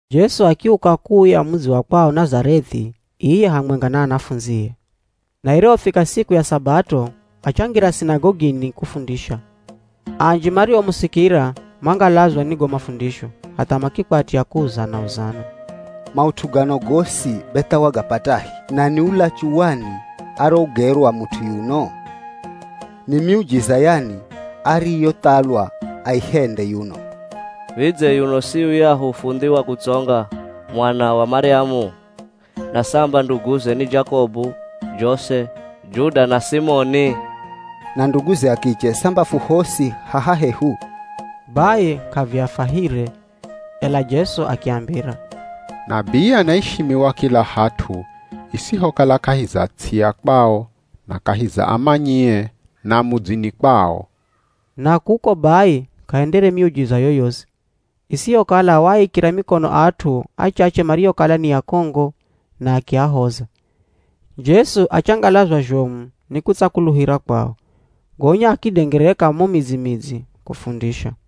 Jesu akiuka kuuya mudzi wa kwao Nazareth'i iye hamwenga na anafundzie. Na irihofika siku ya Sabato, achangira sinagogini kufundisha. Anji mariomusikira mangalazwa ni go mafundisho hatha makikwatya kuuzana-uzana, “Maut'u gano gosi be tha wagapatahi? Na ni ulachu wani arougerwa mut'u yuno? Ni miujiza yani ariyothalwa aihende yuno? Vidze yuno si yuyahu fundhi wa kutsonga, mwana wa Maryamu? Na samba nduguze ni Jakobu, Jose, Juda na Simoni? Na nduguze a kiche samba fu hosi haha hehu?” Bai k'aviafahire. Ela Jesu akiambira, “Nabii anaishimiwa kila hat'u isihokala kahi za ts'i ya kwao, na kahi za amanyie, na mudzini kwao.” Na kuko bai k'ahendere miujiza yoyosi, isihokala waaikira mikono at'u achache mariokala ni akongo na akiahoza. Jesu achangalazwa zhomu ni kutsakuluhira kwao. Gonya akidengereka mo midzi-midzi kufundisha.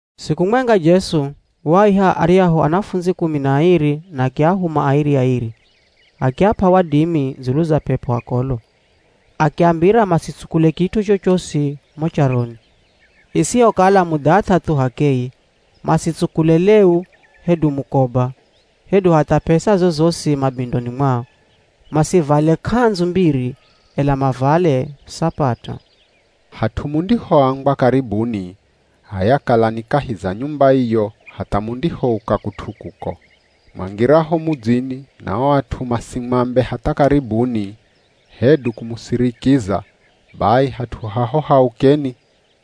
Siku mwenga Jesu waaiha aryahu anafundzi kumi na airi na akiahuma airi-airi. Akiap'a wadimi dzulu za p'ep'o akolo. Akiambira masitsukule kit'u chochosi mo charoni, isihokala mudhath'a thu h'akeye. Masitsukule leu, hedu mukoba, hedu hatha p'esa zozosi mabindoni mwao. Masivale k'andzu mbiri, ela mavale sapata. “Hat'u mundihoambwa ‘Karibuni’ h'aya kalani kahi za nyumba iyo hatha mundihouka kut'u kuko. Mwangiraho mudzini na o at'u masimwambe hatha ‘Karibuni’ hedu kumusirikiza bai hat'u haho haukeni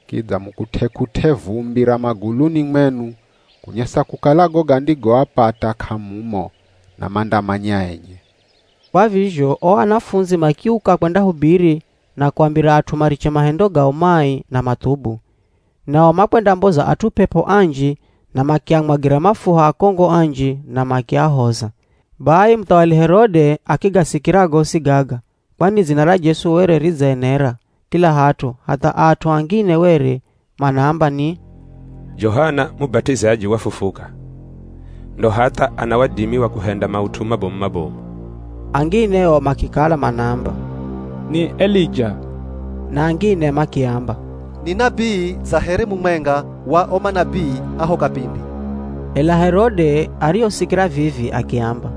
kidza mukut'e-kut'e vumbi ra maguluni mwenu kunyesa kukala go gandigoapata k'amumo na mandamanya enye.” Kwa vizho o anafundzi makiuka kwendahubiri na kuambira at'u mariche mahendo gao mai na mathubu. Nao makwendamboza at'u p'ep'o anji na makiamwagira mafuha akongo anji na makiahoza. Bai muthawali Herode akigasikira gosi gaga kwani dzina ra Jesu were ridzaenera kila hat'u hatha at'u angine were manaamba ni, “Johana Mubat'izaji, wafufuka, ndo hatha ana wadimi wa kuhenda maut'u mabomu-mabomu.” Angine o makikala manaamba, “Ni Elija” na angine makiamba, “Ni nabii dza here mumwenga wa o manabii a ho kapindi.” Ela Herode arihosikira vivi akiamba,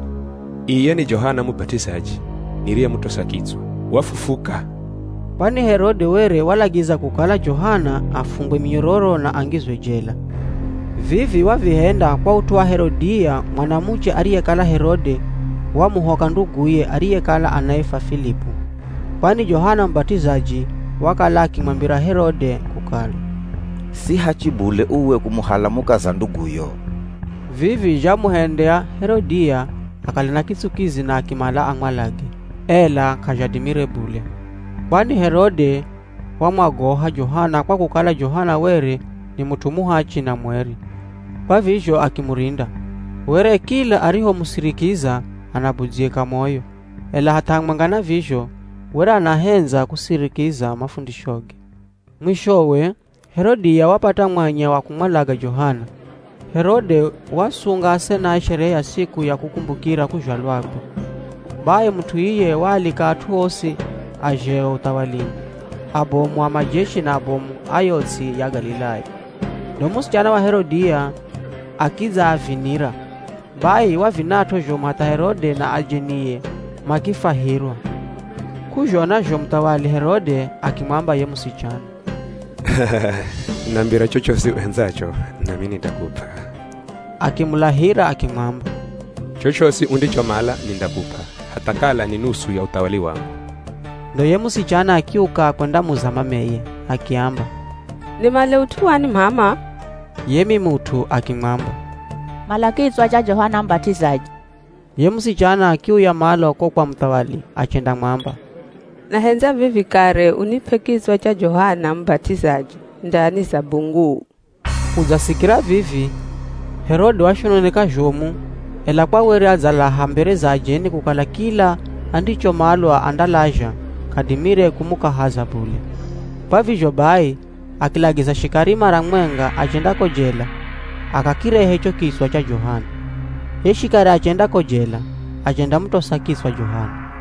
“Iye ni Johana Mubat'izaji niriyemutosa kitswa, wafufuka!” Kwani Herode were walagiza kukala Johana afungwe minyororo na angizwe jela. Vivi wavihenda kwa ut'u wa Herodia mwanamuche ariyekala Herode wamuhoka nduguye ariyekala anaifwa Filipu. Kwani Johana Mubat'izaji wakala akimwambira Herode kukala, “Si hachi bule uwe kumuhala mukaza nduguyo.” Vivi zhamuhendya Herodia akale na kitsukizi na akimala amwalage, ela k'azhadimire bule. Kwani Herode wamwagoha Johana kwa kukala Johana were ni mut'u muhachi na mweri, kwa vizho akimurinda. Were kila arihomusirikiza anabudzyika moyo, ela hatha hamwenga na vizho were anahendza kusirikiza mafundishoge. Mwishowe, Herodia wapata mwanya wa kumwalaga Johana. Herode waasunga asenae sherehe ya siku ya kukumbukira kuzhalwakwe. Bai mut'u iye waalika at'u osi a zheo uthawalini, abomu a majeshi na abomu a yo ts'i ya Galilaya. Ndo musichana wa Herodia akidzaavinira. Bai wavinat'o zhomu hatha Herode na ajenie makifwahirwa. K'uzhona zho muthawali Herode akimwamba ye musichana, “Nambira chochosi uhendzacho nami nindakup'a.” Akimulahira akimwamba, “Chochosi undichomala nindakup'a, hatha kala ni nusu ya uthawali wangu.” Ndo ye musichana akiuka kwendamuza mameye. Akiamba, “Nimale ut'u wani m'ama?” Ye mimut'u akimwamba, “Mala kitswa cha Johana Mubat'izaji.” Ye musichana akiuya malo ko kwa muthawali achendamwamba, “Nahendza vivi kare unip'e kitswa cha Johana Mubat'izaji ndani za bunguu.” Kudzasikira vivi, Herode washononeka zhomu, ela kwa were adzalaha mbere za ajeni kukala kila andichomalwa andalazha k'adimire kumukahaza bule. Kwa vizho bai akilagiza shikari mara mwenga achenda ko jela akakirehe cho kitswa cha Johana. Ye shikari achenda ko jela achendamutosa kitswa Johana,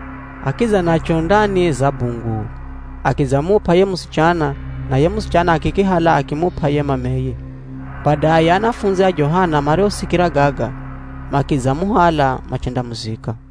akidza nacho ndani za bunguu, akidzamup'a ye musichana na ye musichana akikihala akimup'a ye mameye. Badaye anafundzi a Johana marihosikira gaga makidzamuhala machendamuzika.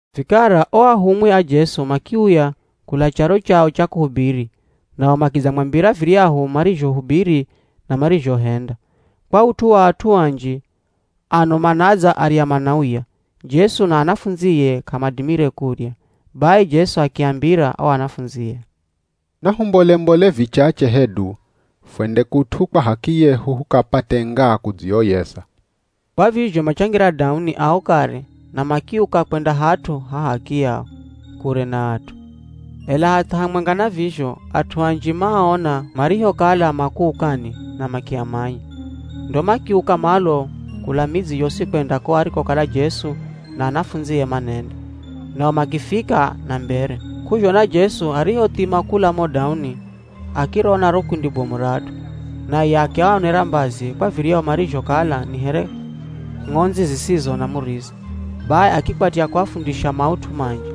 Vikara o ahumwi a Jesu makiuya kula charo chao cha kuhubiri nao makidzamwambira viryahu marizhohubiri na marizhohenda. Kwa ut'u wa at'u anji, ano manadza arya manauya, Jesu na anafundzie k'amadimire kurya. Bai Jesu akiambira o anafundzie, “Nahumbole-mbole vichache hedu fwende kut'u kwa h'akiyehu hukapate ngaa kudzioyeza.” Kwa vizho machangira dauni ao kare na makiuka kwenda hat'u ha h'akiyao, kure na at'u. Ela hatha hamwenga na vizho at'u anji maaona marihokala makuukani na makiamanya. Ndo makiuka malo kula midzi yosi kwenda ko arikokala Jesu na anafundzie manenda, nao makifika na mbere. K'uzhona Jesu arihothima kula mo dauni akirona ro kundi bomu ra at'u, naye akiaonera mbazi kwa viryahu marizhokala ni here ng'ondzi zisizo na murisa. Bai akikwatya kuafundisha maut'u manji.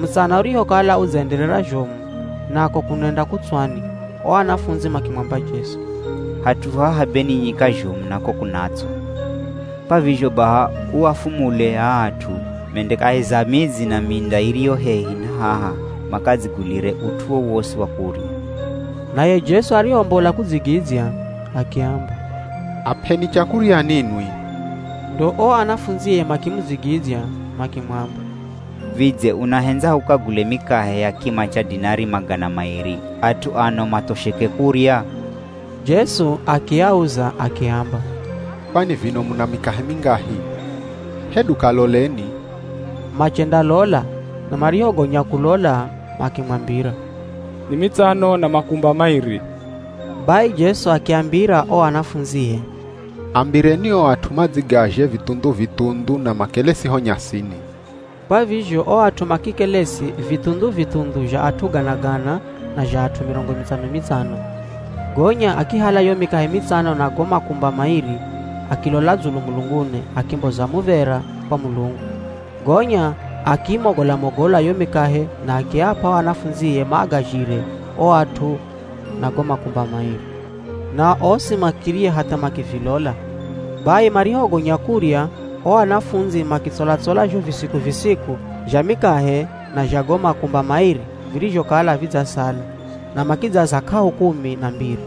Mutsana urihokala udzaenderera zhomu nako kunenda kutswani, o anafundzi makimwamba Jesu, “Hat'u haha be ni nyika zhomu nako kunatswa. Kwa vizho baha uafumule aa at'u mende kahi za midzi na minda iriyo hehi na haha makadzigulire ut'u wowosi wa kurya.” Naye Jesu arihombola kudzigidzya akiamba, “Ap'eni chakurya ninwi.” Ndo o anafundzie makimudzigidzya makimwamba, “Vidze unahendza hukagule mikahe ya kima cha dinari magana mairi at'u ano mathosheke kurya?” Jesu akiauza akiamba, “Kwani vino muna mikahe mingahi? Hedu kaloleni,” machendalola na marihogonya kulola makimwambira, “Ni mitsano na makumba mairi.” Bai Jesu akiambira o anafundzie, “Ambireni o at'u madzigazhe vithundhu-vithundhu na makelesi ho nyasini.” Kwa vizho o at'u makikelesi, vithundhu-vithundhu zha at'u gana-gana na zha at'u mirongo mitsano-mitsano. Gonya akihala yo mikahe mitsano na go makumba mairi, akilola dzulu mulunguni, akimboza muv̱era kwa Mulungu, gonya akiimogola-mogola yo mikahe na akiap'a o anafundzie maagazhire o at'u na go makumba mairi. Nao osi makirya hatha makivilola. Bai marihogonya kurya o anafundzi makitsola-tsola zho visiku-visiku zha mikahe na zha go makumba mairi virizhokala vidzasala, na makidzaza k'ahu kumi na mbiri.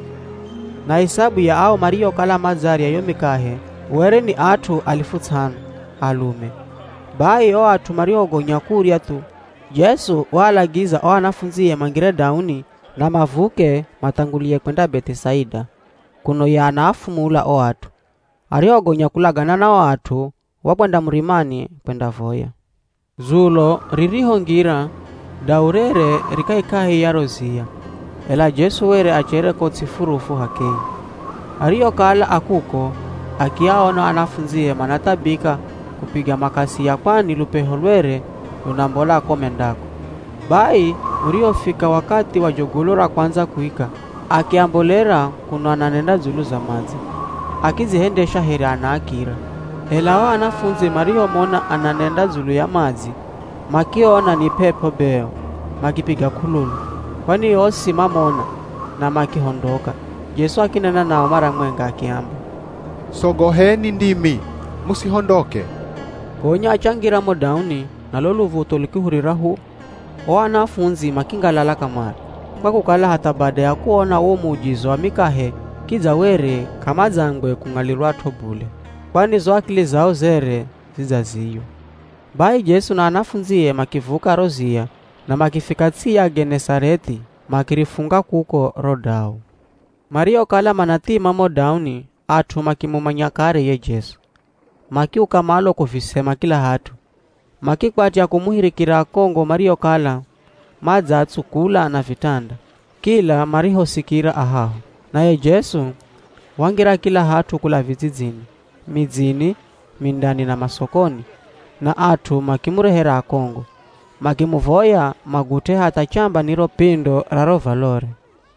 Na isabu ya ao mariokala madzarya yo mikahe were ni at'u alifu ts'ano, alume. Bai o at'u marihogonya kurya thu, Jesu waalagiza o anafundzie mangire dauni na mavuke mathangulie kwenda Beth'isaida, kuno ye anaafumula o at'u. Arihogonya kulagana na o at'u, wakwenda murimani kwendavoya. Dzulo ririhongira, dau rere ri kahikahi ya ro ziya, ela Jesu were achere ko ts'i furufu h'akeye. Arihokala a kuko, akiaona o anafundzie manathabika kupiga makasia kwani lupeho lwere lunambola ko mendako. Bai urihofika wakathi wa jogolo ra kwandza kuika, akiambolera kuno ananenda dzulu za madzi. Akidzihendesha here anaakira. Ela o anafundzi marihomona ananenda dzulu ya madzi, makiona ni p'ep'o be o, makipiga k'ululu. Kwani osi mamona, na makihondoka. Jesu akinena nao mara mwenga akiamba, “Sogoheni ndimi, musihondoke.” Gonya achangira mo dauni na lo luv̱utho lukihurira hu! O anafundzi makingalala kamare, kwa kukala hatha bada ya kuona wo muujiza wa mikahe kidza were k'amadzangwe kung'alirwat'o bule kwani zo akili zao zere zidzaziywa. Bai Jesu na anafundzie makivuka ro ziya na makifika ts'i ya Genezarethi makirifunga kuko ro dau. Marihokala manathima mo dauni at'u makimumanya kare ye Jesu. Makiuka malo kuvisema kila hat'u, makikwatya kumuhirikira akongo mariokala madzaatsukula na vitanda, kila marihosikira a haho. Naye Jesu, wangira kila hat'u kula vidzidzini, midzini, mindani na masokoni na at'u makimurehera akongo, makimuvoya magut'e hatha chamba ni ro pindo ra ro valore,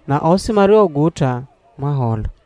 na osi mariorigut'a mahola.